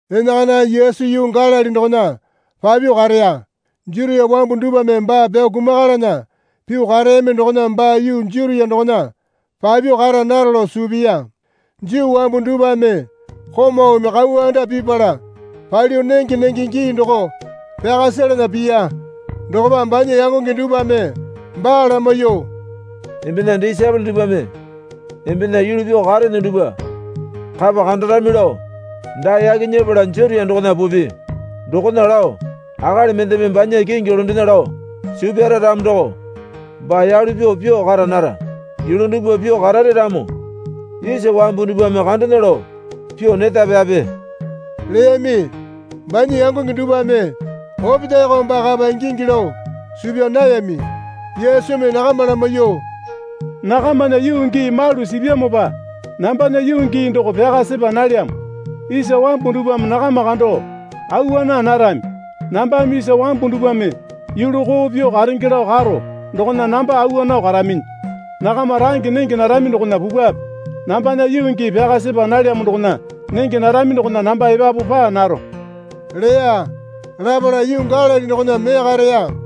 Enakana Yesu yuu Galili dokona papyuo kareya. Jutia wambu dupwame baa pyao kumakalana pyuo kareyami dokona baa yuu Jutia dokona papyuo kara naro lao suu piya. Juu wambu dupwame komaume kauwa anda pipala palyuo nenge nenge gii doko pyaka selana piya. Dokopa banya yangonge dupwame baa lamaiyuo, Embena disaepole dupwame embena yulu pyuo karene dupwa kapa kandarami lao dae yaki nyepala Jutia dokona pupi. Dokona lao akali mendeme banya kingi londena lao suu pyara ramo doko baa yalu pyuo pyuo kara nara. Yulu dupwa pyuo karare ramo isa wambu dupwame kandena lao pyuo neta pyape leyami. Banya yangonge dupwame opetaeko baa kapa ingingi lao suu pyaa nayami. Yesumi nakama lamaiyuo, Nakamana yuu gii malu sipyamopa nambana yuu gii doko pyaka sepa nalyamo. Isa wambu dupwame nakama kando awa naa narami. Nambame isa wambu dupwame yulu koo pyuo karenge lao karo dokona namba awa nao karaminyi. Nakama range nenge narami dokona pupwape. Nambana yuu gii pyaka sepa nalyamo dokona nenge narami dokona namba epapu paa naro leya. Lapala yuu Galili dokona mee kareya.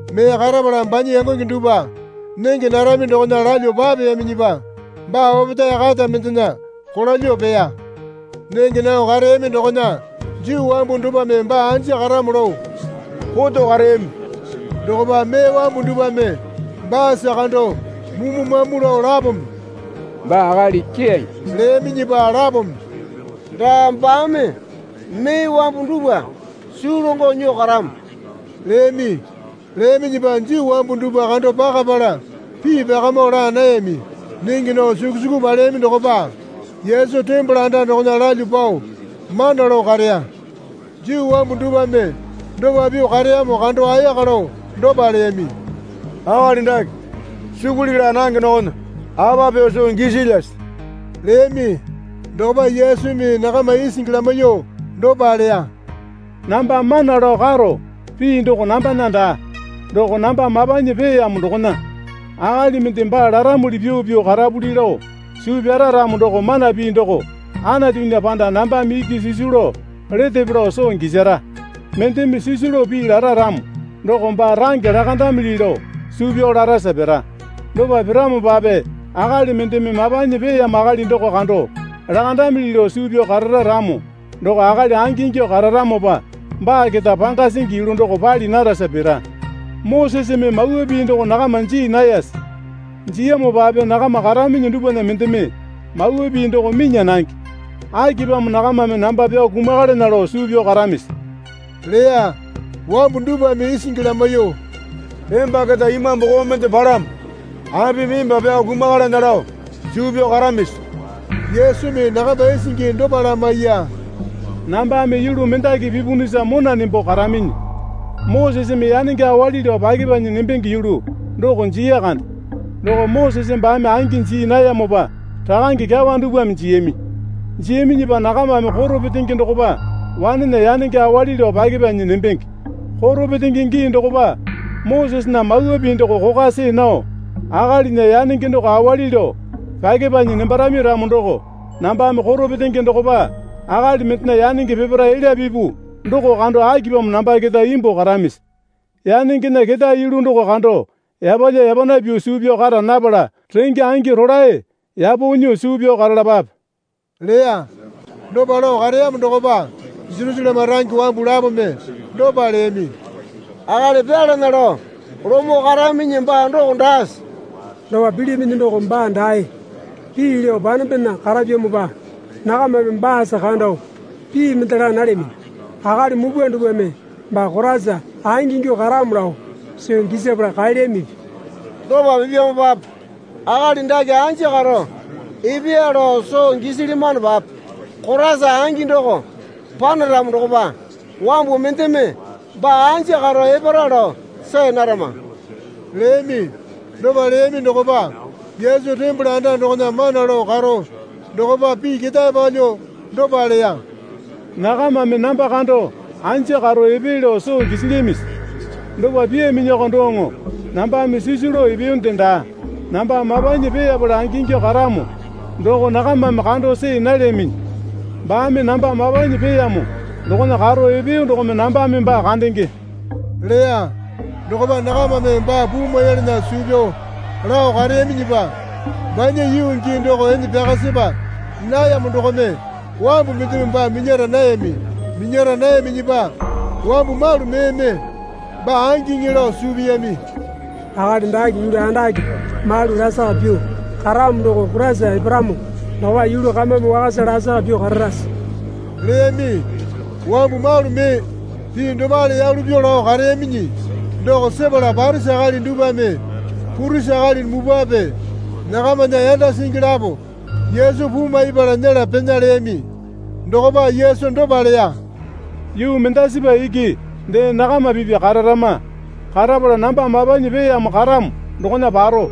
Mee karapala banya yangonge dupwa nenge narami dokona lalyuo papeyaminyipa baa opetae kata mendena kolalyuo peya. Nenge nao kareyami dokona Juu wambu dupwame baa anja karamo lao koto kareyami. Dokopa mee wambu dupwame baasa kando mumu mamu lao lapome, Baa akali keyange, leyaminyipa lapome, Daa baame mee wambu dupwa suu longo nyuo karamo, leyami. Leyaminyipa Juu wambu dupwa kando pakapala pii pyakamo laa nayami. Nenge nao suku suku paleyami dokopa Yesu tembole anda dokona lalyuo pao mana lao kareya. Juu wambu dupwame dopa pyuo kareyamo kando ayaka lao dopa leyami. Akali dake sukuli laa nange dokona apa pyuo soo gisilyase? leyami. Dokopa Yesumi nakama isingi lamaiyuo dopa leya. Namba mana lao karo pii doko nambana daa. Doko namba mapanyi peeyamo dokona. Akali mende baa laramuli pyuo pyuo karapuli lao suu pyara ramo doko mana pii doko Anatunya panda nambame iki sisu lao letepe lao soo gisara. Mendeme sisu lao pii lara ramo doko baa range lakandamili lao suu pyao larasa pira. Dopa piramopape akali mendeme mapanyi peeyamo akali doko kando lakandamili lao suu pyao karara ramo doko akali angingyuo kararamopa baa keta panga singi yulu doko pali narasa pira. Moseseme Mawa Pii doko nakama jii nayase? Jiyamopape nakama karaminyi dupwana mendeme Mawa Pii doko minya nange. Akipamo nakamame namba pyao kumakalana lao suu pyao karamisi? leya. Wambu dupwame isingi lamaiyuo, Emba keta imambu koo mende palamo. Apimi emba pyao kumakalana lao suu pyao karamisi? Yesumi nakama isingi dopa lamaiya. Nambame yulu mendaki pipunusa mona nembo karaminyi. Moseseme yanenge awali lao pyakepanyi nembenge yulu doko jiya kande. (Doko Mosese baame angi jii nayamopa rakange kyawa dupwame jiyami.) Jiyaminyipa nakamame koro petenge dokopa wanena yanenge awali lao pyakepanyi nembenge. Koro petenge gii dokopa Mosesena Mawa Pii doko kokwa see nao akalinya yanenge doko awali lao pyakepanyi nembarami ramo doko nambame koro petenge dokopa akali mendena yanenge peparae elya pipu doko kando akipamo namba keta imbuo karamisi? Yanengena ketae yulu doko kando yapalya yapana pyuo suu pyao kara napala renge angi rolae yapo nyuo suu pyao karalapape leya. Dopa lao kareyamo dokopa Jerusaleme range wambu lapome dopa leyami. Akali pyalana lao lomo karaminyi baa doko daase? Dopa pilyaminyi doko baa dae pii lao panembena karapyamopa nakamame baasa kando pii mende laa nalyaminyi. Akali mupwa dupwame baa Koraisa angingyuo karamo lao soo gisapala kaelyamipi? Dopa pipyamopape akali dake anja karo epeya lao soo gisilyamanopape Koraisa angi doko panaramo dokopa wambu mendeme baa anja karo epara lao see narama leyami. Dopa leyami dokopa Yesu tembole anda dokona mana lao karo dokopa pii ketae palyuo dopa leya. Nakamame namba kando anja karo epee lao soo gisilyamisi? Dopa pyaaminyiko doŋo nambame sisu lao epeyonde daa. Namba mapanyi peeyapala angingyuo karamo doko nakamame kando see nalyaminyi. Baame namba mapanyi peeyamo dokona karo epeyo dokome nambame baa kandenge leya. Dokopa nakamame baa puu maiyalana suu pyao lao kareyaminyipa banya yuu gii doko ene pyaka sepa nayamo dokome wambu mendeme baa minyara nayami. Minyara nayaminyipa wambu malu meeme baa angiŋi lao suu piyami. Akali dake yulu andake malu lasaka pyuo karamo doko Koraisa eparamo dokopa yulu kamame wakasa lasaka pyuo kararase? leyami. Wambu malu mee pii dopale yalu pyuo lao kareyaminyi doko sepala Parisi akali dupwame purisi akali mupwape nakamana yanda singi lapo Yesu puu maipala nyela pena leyami. Dokopa Yesu dopa leya. Yuu mendasipa iki dee nakama pipya kararama. Karapala namba mapanyi peeyamo karamo dokona paro.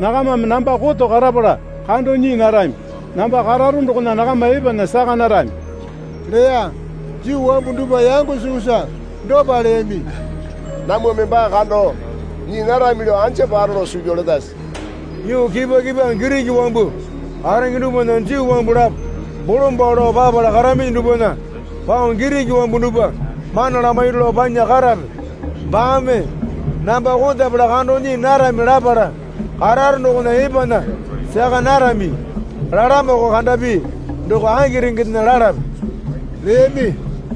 Nakamame namba koto karapala kando nyii narami. Namba kararo dokona nakama epana saka narami leya. Juu wambu dupwa yango sukusa dopa leyami. Namwame baa kando nyii narami lao anja paro lao suu pyao letase? Yuu kipwa kipwa Giriki wambu karenge dupwana Juu wambu lapo bolombalo lao papala karaminyi dupwana pao Giriki wambu dupwa mana lamairu lao panya karape? Baame, Namba kotapala kando nyii narami lapala kararo dokona epana saka narami, lalamoko kandapi doko aki rengendena lalape? leyami.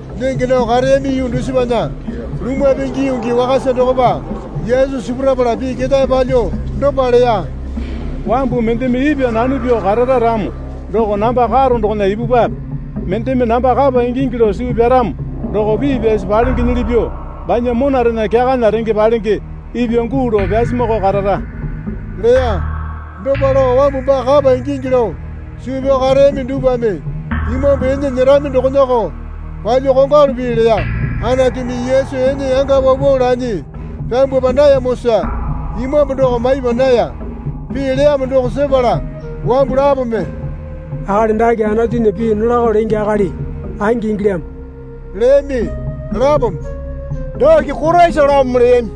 Nenge nao kareyami yuu dusipana lumwa pingi yuu gii wakasa dokopa Yesu sipurapala pii ketae palyuo dopa leya. Wambu mendeme ipwa nano pyuo karara ramo doko namba karo dokona ipupwape. Mendeme namba kapa ingingi lao suu pyaramo doko pii pyasi palengenyili pyuo banya monarena kyakana renge palenge ipwa guu lao pyasumakao karara leya. Dopa lao wambu baa kapa ingingi lao suu pyao kareyami dupwame Imambu ene nyerami dokonako palyuo kongwalu pii leya. Anatumi Yesu ene yanga paupau lanyi pyambwapa nayamosa Imambu doko maipa naya. Pii leyamo doko sepala wambu lapome, Akali dake Anatunya pii nolako lenge akali angi ingilyamo leyami. Lapome, Dake Koraisalamo leyami.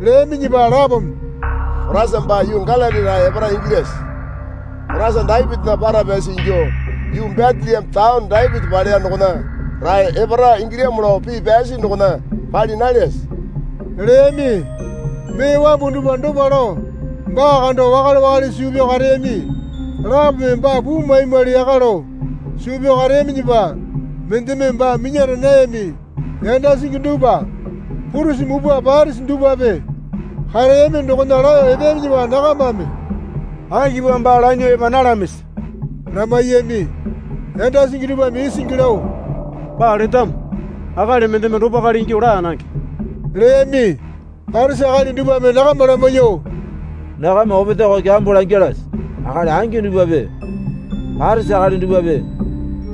Leyaminyipa lapome, Koraisa baa yuu Galili rae epara ingilyase? Koraisa Dapitinya para pyasi ingyuo yuu Beteleme taone Dapiti paleya dokona rae epara ingilyamo lao pii pyasi dokona pali nalyase? leyami. Mee wambu dupwa dopa lao baa kando wakale wakale suu pyao kareyami. Lapome baa puu maimwali yaka lao suu pyao kareyaminyipa mendeme baa minyara nayami. Yanda singi dupwa purisi mupwa Parisi dupwape kareyami dokona laeyo epeyaminyipa nakamame, Akipamo baa lanyuo epa nalamisi? lamaiyami. Yanda singi dupwame isingi lao, Baa letamo akali mendeme dopakale ingyuo laa nange leyami. Parisi akali dupwame nakama lamaiyuo, Nakama opetaeko kyambo langalase? Akali angi dupwape Parisi akali dupwape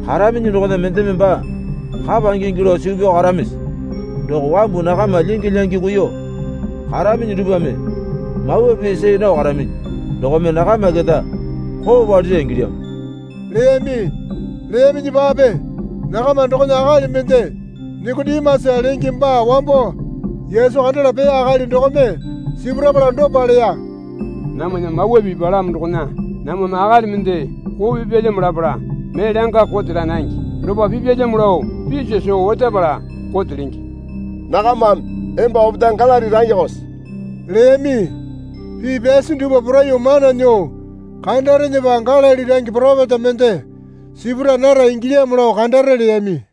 karaminyi dokona mendeme baa kapa ingingi lao suu pyao karamisi? Doko wambu nakama lyingi lyangi kuiyuo karaminyi dupwame Mawa Pii see nao karaminyi dokome nakama keta koo palira ingilyamo leyami. Leyaminyipape nakama dokona akali mende Nikotimasa lenge baa wambo Yesu kandala peya akali dokome sipurapala dopa leya. Namwana Mawa Pii palamo dokona, Namwame akali mende koo pipyalyamo lapala mee langa kote laa nange. Dopa pipyalyamo lao piso soo otapala kote lenge. Nakamame, Emba opetae Galili rangekose? leyami. Pii pyasi dupwa poraiyuo mana nyuo kandarenepa Galili range poropeta mende sipura nara ingilyamo lao kandare leyami.